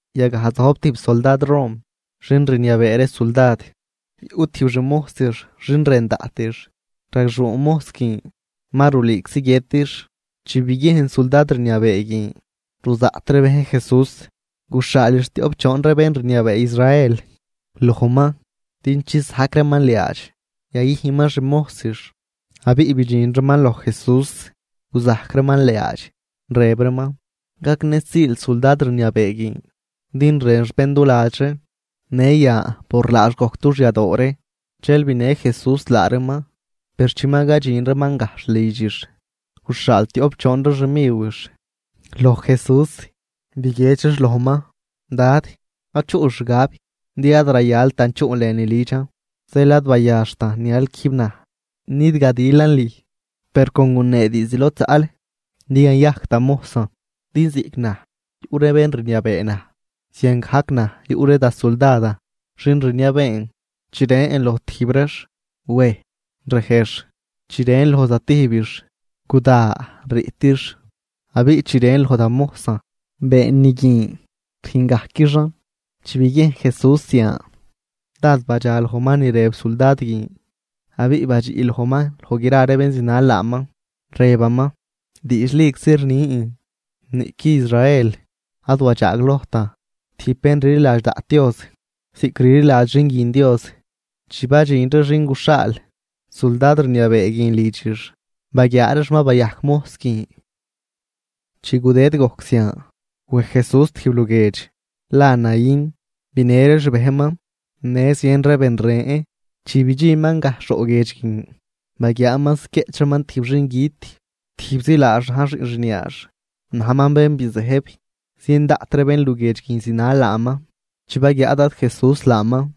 Yagaj zojb tijb suldad Rom xin rniabee ree suldad. Yuꞌ tijb xmojsix xin rën daꞌtix, ragxuu mojs guin ma rulüüczi guiëtix. Chi biguiejn suldad rniabee guin ruzaꞌt ree bejn Jesús, guxhaalix tioꞌp choon ree bén rniabee Israel lojman din chisajc reeman liaadx yayüjnman xmojsix. Abiꞌ bidxin reeman loj Jesús guzajc reeman liaadx, rëb reeman: ―Gagnësiil suldad rniabee guin, din rënx bén duladx ree, në yan por laax gojc dux yadoo ree. Dxel binë Jesús laa reeman. Per chi ma cadxin reeman gajxh lidxix, guxhaal tioꞌp choon ree xmiwix loj Jesús biguiedx reex lojman: ―Dad, ad chuꞌl xgab, din ad rayaltan chuꞌl lënü lidxan, zeel ad bayaxtan nial quijb naj nidgadilan lüj. Per con gunee diizd lod zaꞌl din yayajc da mojsan. Din ziꞌc naj yuꞌ ree bén rniabee naj, ziangajc naj yuꞌ ree da suldadan xin rniabeen. Chi rën loj tijb reex: “Wej”, rejx. Chi rën loj zatijbix: “Guda”, riꞌtix. Abiꞌ chi rën loj da mojsan: Been ni guin, rüjngajquixan. Chi biguiejn Jesús zian, dád badxa lojman ni rëb suldad guin, abiꞌ badxiꞌ lojman loj gra ree bén zinal laaman, rëbaman: ―Diidxliczi rnin, niꞌqui Israel ad wadxaaglojtan tijb bén rliladx daꞌt Dios ziꞌc rliladx xin guin Dios. Chi badxin ree xin guxhaal suldad rniabee guin lidxix, baguiaa reex ma bayajc mojs guin. Chi gudëd gojc zian, wej Jesús tijb luguiedx la Naín binë ree xbejnman, në zien ree ben ren. Chi bidxinman gajxh roꞌ guiedx guin, baguiaaman ziquieꞌch reeman tijb xingüt, tijbzi laax na̱j xiꞌn xniaax, najman bén bizëjb. Zien daꞌt ree bénluguiedx guin zinal laaman. Chi baguiaa Dad Jesús laaman,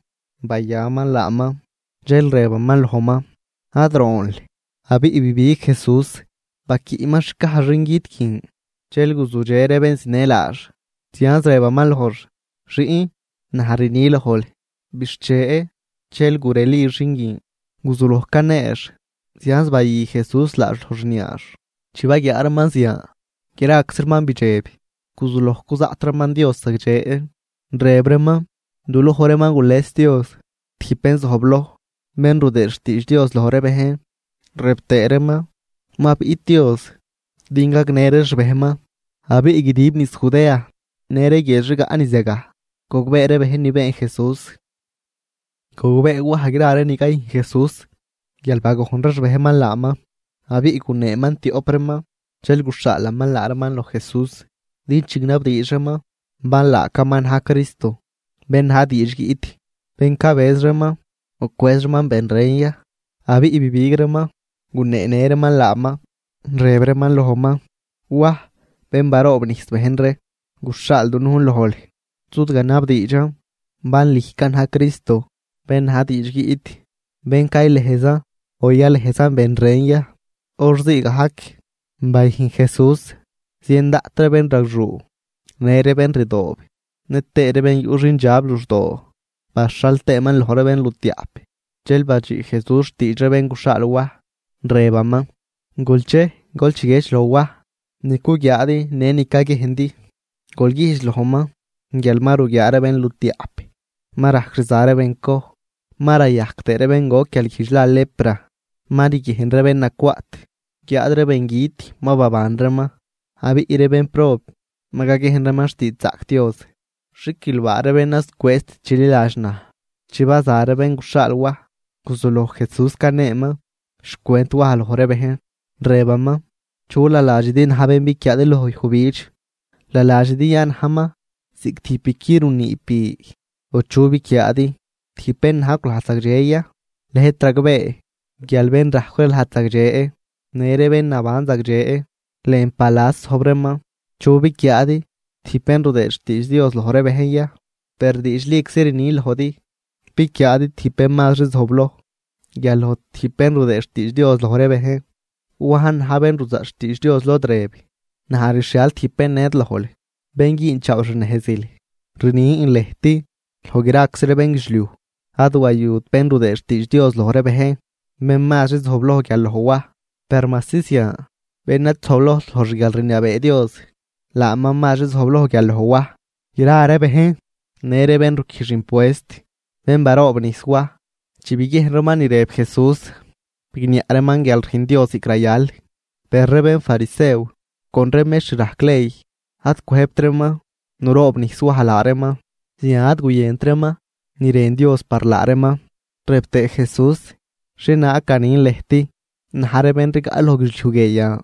bayaman laaman, dxel rëbaman lojman: ―Ad roonl. Abiꞌ bibig Jesús baquiꞌman xcaj xingüt guin, dxel guzudxe ree bén zinë laax. Zianz rëbaman lojx: ―Xiꞌn, naj rni lojl: ¡Bixche! Dxel gureli xin guin, guzuloj caneex, zianz bayü Jesús laax loj xniaax. Chi baguiaa reeman zian, graczi reeman bidxeb guzuloj cuzaꞌt reeman Dios zagdxe, rëb reeman: ―Du loj ree ma gules Dios tijb bén zojbloj, bén rudëë xtiidx Dios loj ree bejn. Rëb tëë reeman: ―Ma biꞌt Dios din gagnë ree xbejnman. Abiꞌ guidib niz Judea në ree guiedx rigaꞌ niz yagaj gogbee ree bejn ni been Jesús. Gogbee Waj gra ree ni cayüjn Jesús, guial bagojn ree xbejnman laaman. Abiꞌ guneeman tioꞌp reeman, dxel guxhaalaman laa reeman loj Jesús din chignabdiidx reeman bal laacaman na̱j Cristo bén na̱j diidx guiꞌt, bén cabëz reeman, o cwëz reeman ben ren ya. Abiꞌ bibig reeman, guneenë reeman laaman, rëb reeman lojman: ―Waj bén ruroobnijs bejn ree guxhaal dunujn lojl zudganabdiidxan bal lüjcan na̱j Cristo bén na̱j diidx guiꞌt, bén caylëjzan o yalëjzan ben ren ya. Hor ziigajc bayüjn Jesús zien daꞌt ree bénragxuu, në ree bén rdoob, nëtëë ree bén yuꞌ xindxab luxdoo, baxhal tëëman loj ree bénlutiaꞌp. Dxel badxiꞌ Jesús xtiidx ree bén guxhaal Waj, rëbaman: ―Gol chej, gol chiguiedx loj Waj ni cuguiaadi në ni caguiejndi. Gol güjdx lojman guial ma ruguiaa ree bénlutiaꞌp, ma rajc rza ree bencoj, ma rayajc tëë ree bén goc guialguijdx la lepra, ma riguiejn ree bén nacwaꞌt, guiáad ree bengüt ma baban reeman, abiꞌ ree bénprob ma caguiejn reeman xtiidxzaꞌc Dios. ¡Xiquilbaa ree bén ad zucwëëzt chililadx naj! Chi baza ree bén guxhaal Waj, guzuloj Jesús caneeman xcwent Waj loj ree bejn, rëbaman: ―¿Chu naladxidi na̱j bén biquiaadi loj yujbidx? ¿Naladxidi ya najman ziꞌc tijb biqui runiib bi? ¿O chu biquiaadi? ¿Tijb bén najcw lajd zagdxe ya? Lëjt ragbee guial bén rajcw ree lajd zagdxe, në ree bén naban zagdxe, lën palas zojb reeman. ¿Chu biquiaadi? ¿Tijb bén rudëë xtiidx Dios loj ree bejn ya? Per diidxliczi rnin lojdi, biquiaadi tijb bén mazri zojbloj guial loj tijb bén rudëë xtiidx Dios loj ree bejn. Wajn na̱j bén ruzaꞌt xtiidx Dios, lod rëb: Naj rxhial tijb bén ned lojl, bén güünchaaw xnejzil. Rnin lëjt, loj graczi ree bénguidxliuj ad wayut bén rudëë xtiidx Dios loj ree bejn, bén mazri zojbloj guial loj Waj. Per majsi zian, bén ad zojblojt loj xguialrniabee Dios, laaman mazri zojbloj guial loj Waj. Gra ree bejn, në ree bén ruquijx impuest bén baroobnijs Waj, chi biguiejn reeman ni rëb Jesús bigniaꞌ reeman guial rüjn Dios ziꞌc rayal. Per ree bénfarisew con ree mextr rajc ley ad cwëjbt reeman nuroobnijs Waj laa reeman, zian ad guyënt reeman ni rën Dios par laa reeman. Rëb tëë Jesús: ―¿Xhienaag ganin lëjt na̱j ree bén rigaꞌ loj guidxliuj guie yan?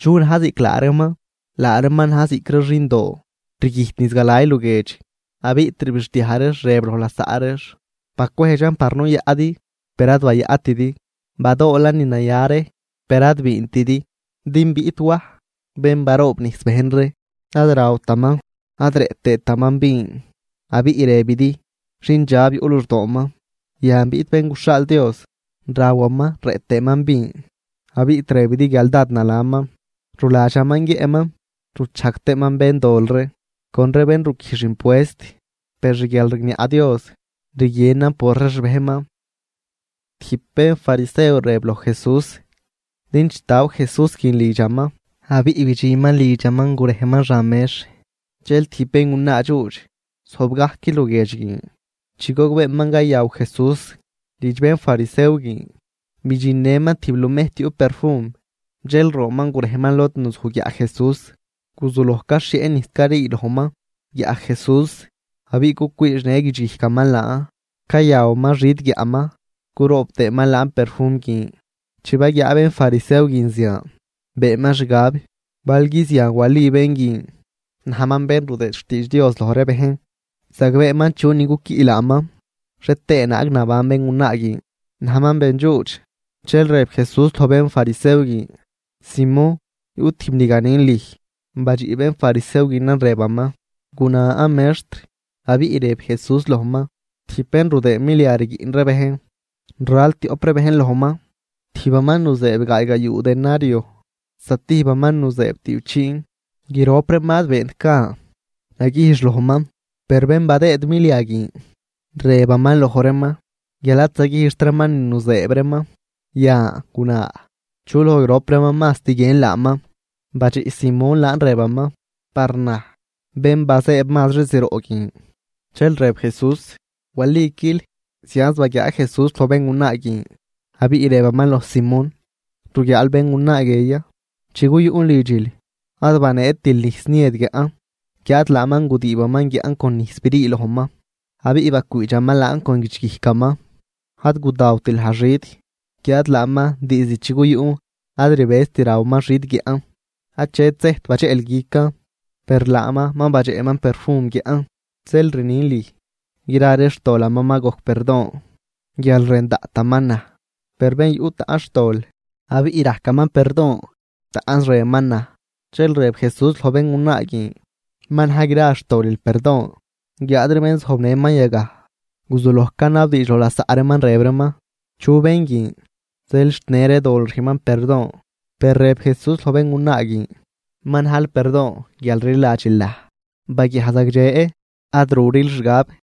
¿Chu na̱j ziꞌc laa reeman? Laa reeman na̱j ziꞌc ree xindoo rguijt niz galay luguiedx, abiꞌ rbixdiaj reex rëb loj lasaꞌ reex: “Bacwejdxan par nuyaꞌdi, per ad bayaꞌtidi, badoolan ni naya ree, per ad biintidi.” Din biꞌt Waj bén baroobnijs bejn ree, ad rawtaman ad rëꞌ tëëtaman vin, abiꞌ rëbidi xindxab yuꞌ luxdooman. Yan biꞌt Bén guxhaal Dios, rawaman rëꞌ tëëman vin, abiꞌ rëbidi guial dád nalaman ruladxaman guiëꞌman, ruchajg tëëman béndol ree con ree bén ruquijx impuest. Per xguialrigniaꞌ Dios, rguienan por ree xbejnman. Tijb bénfarisew rëb loj Jesús din chitaw Jesús guin lidxaman. Abiꞌ bidxinman lidxaman gurejman xan mex. Dxel tijb béngunaa dxuudx zojb gajc luguiedx guin. Chi gogbeeman cayaw Jesús lidx bénfarisew guin, bidxinnëman tijb lumejt yuꞌ perfum. Dxel roonman gurejman lod nuzuj guiaꞌ Jesús, guzuloj caxhieꞌ nijs carii lojman guiaꞌ Jesús. Abiꞌ cucwiidxnë guidxguijcaman laan, cayawaman xid guiaꞌman curoob tëëman laan perfum guin. Chi baguiaa bénfarisew guin zian, beenman xgab: “Balgui zian wali bén guin najman bén rudëë xtiidx Dios loj ree bejn, zagbeeman chunin cuquiꞌ laaman xhie tëë naag naban béngunaa guin, najman bendxuudx.” Dxel rëb Jesús loj bénfarisew guin: ―Simón, yuꞌ tijb ni ganin lüj. Badxiꞌ bénfarisew guinan rëbaman: ―Gunan, mextr. Abiꞌ rëb Jesús lojman: ―Tijb bén rudëëd milia rguiꞌn ree bejn, ral tioꞌp ree bejn lojman. Tijbaman nuzëëb gaaygayuu denario, zatijbaman nuzëëb tüꞌpchiin. Grop reeman ad beent gan naguijx lojman, per bén badëëd milia guin rëbaman loj reeman guial ad zaguijxt reeman ni nuzëëb reeman. Yan guna, ¿chu loj grop reeman mazt guiën laaman? Badxiꞌ Simón laan, rëbaman: ―Par naj, bén bazëëb mazri zroꞌ guin. Dxel rëb Jesús: ―Waliquil. Zianz baguiaa Jesús loj béngunaa guin, abiꞌ rëbaman loj Simón: ―¿Ruguiaal béngunaa guie ya? Chi guyuꞌn lidxil ad baneetil nijs niëd guiaꞌn. Guiáad laaman gudiibaman guiaꞌn con nijs brii lojman, abiꞌ bacwiidxaman laan con guidxguijcaman. Ad gudawtil naj xid, guiáad laaman diizd chi guyuꞌn ad rbëzt rawaman xid guiaꞌn. Achet sejt badxeꞌl guican, per laaman ma badxeꞌman perfum guiaꞌn. Zeel rnin lüj, gra ree xtolaman ma gojc perdon guial rën daꞌtaman naj. Per bén yuꞌ taꞌnz xtol abiꞌ rajcaman perdon, taꞌnz rënman naj. Dxel rëb Jesús loj béngunaa guin: ―Ma na̱j gra xtolil perdon. Guiáad ree bén zojbnëman yagaj guzuloj canabdiidx loj lasaꞌ reeman, rëb reeman: ―¿Chu bén guin zeel xt në ree dol rüjnman perdon? Per rëb Jesús loj béngunaa guin: ―Ma najl perdon guial rliladxil naj, baguiaj zagdxe ad ruril xgab.